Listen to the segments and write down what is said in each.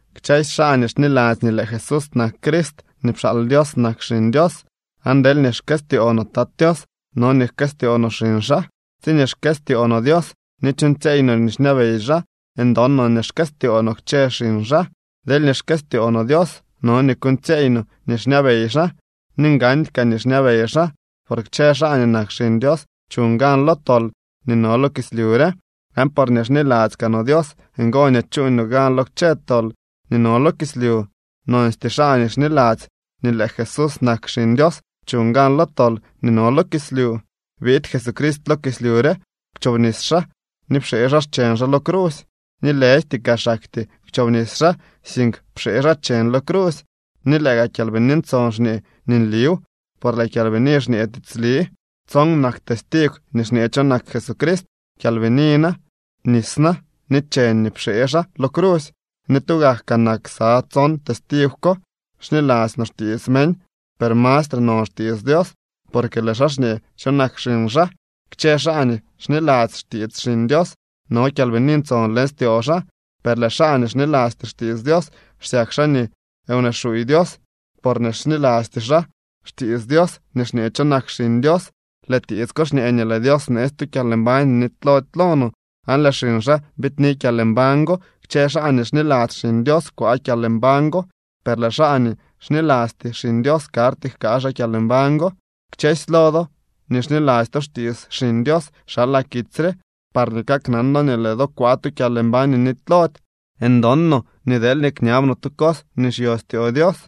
Kchësy xaa nii xniladzy nii lëë Jesús nak Crist nii pxaal Dios nak xiñ Dios, aan deelñee xkëstyoo no Tat Tios, no nii jkëstyoo no xiñ xaa. Tsiñee xkëstyoo no Dios ni chuuñtsyeey no nii xñabey xaa, ndon no nii xkëstyoo no kchë xiñ xaa. Deelñee xkëstyoo no Dios, no nii kuuñtsyeey no nii xñabey xaa ni ngandy kaa nii xñabey xaa. Por kchë xaa nii nak xiñ Dios chuñ gan lo tol nii no lo kislyu re, aan porñee xniladzy kaa no Dios ngo nii chuuñ no gan lo kchë tol nii no lo kislyu. Nonstyee xaa nii xniladzy nii lëë Jesús nak Xiñ Dios chuñ gan lo tol nii no lo kislyu. Biid Jesucrist lo kislyu re, kwchobnis xaa ni pxee xaa xcheñ xaa lo crusy, ni lëjty kaa xaktyee kwchobnis xaa, sink pxee xaa cheñ lo crusy. Ni lëë gaa Kyalbini Ntson xñee nii nliw, por lëë Kyalbini xñee tiitsli. Tson nak testigw nii xñee cho nak Jesucrist: Kyalbini na, nis na ni cheñ nii pxee xaa lo crusy, ni tugak kaa nak ksa tson testigw ko. Xniladzy no xtiits meñ, per mastre non xtiits Dios, porque lëë xaa xñee cho nak xiñ xaa. Kchë xaa nii xniladzy xtiits Xiñ Dios no Kyalbini Ntson leñ styoo xaa, per lëë xaa nii xnilasty xtiits Dios xsyak xaa nii wnee xuuy Dios, porñee xnilasty xaa xtiits Dios nii xñee cho nak Xiñ Dios. Lëë tiits ko xñee nii lëë Dios bneetsy tu kyalmbañ nii nitylody lo no, aan lëë xiñ xaa biidni kyalmbañ go. Kchë xaa nii xniladzy Xiñ Dios kwaa kyalmbañ go, per lëë xaa nii xnilasty Xiñ Dios karty jkaa xaa kyalmbañ go. Kchësy lo do nii xniladzy to xtiits Xiñ Dios xalaa kitsy re parñee kaknan do nii lëë do kwaa tu kyalmbañ nii nitylody. Ndon no nii deelñee kñab no tu cos nii xyo styoo Dios,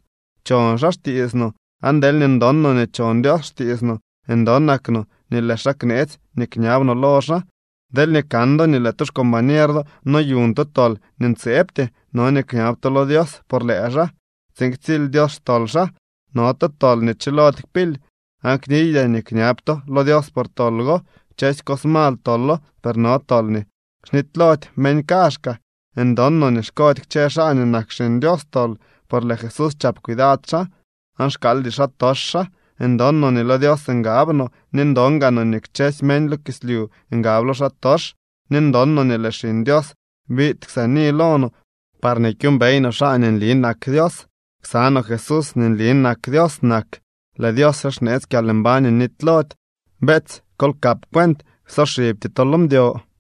chon xaa xtiits no. Aan deelñee ndon no nii chon Dios xtiits no, ndonak no nii lëë xaa kneetsy nii kñab no lo xaa. Deelñee kan do nii lëë tu xcombañer do noyuñ tu tol nii ntseebty, no nii kñab to lo Dios por lëë xaa tsiin ktsily Dios xtol xaa. No tu tol nii chilody kpily aan kniydyaa nii kñab to lo Dios por tol go. Kchësy cos mal tolo, per no tol nii xnitylody meñ kaazhkaa. Ndon no nii xkody kchë xaa nii nak xiñ Dios tol, por lëë Jesús chap cuidad xaa, aan xkaaldy xaatox xaa. Ndon no nii lo Dios ngab no, ni ndon gaa no nii kchësy meñ lo kislyu ngab lo xaatox. Ni ndon no nii lëë Xiñ Dios biid ksaani lo no parñee kyuumbey no xaa nii nli nak Dios. Ksa no Jesús nii nli nak Dios nak. Lëë Dios re xneetsy kyalmbañ nii nitylody. Beetsy, kol kap cuent, ksoxibty to lo mdyo.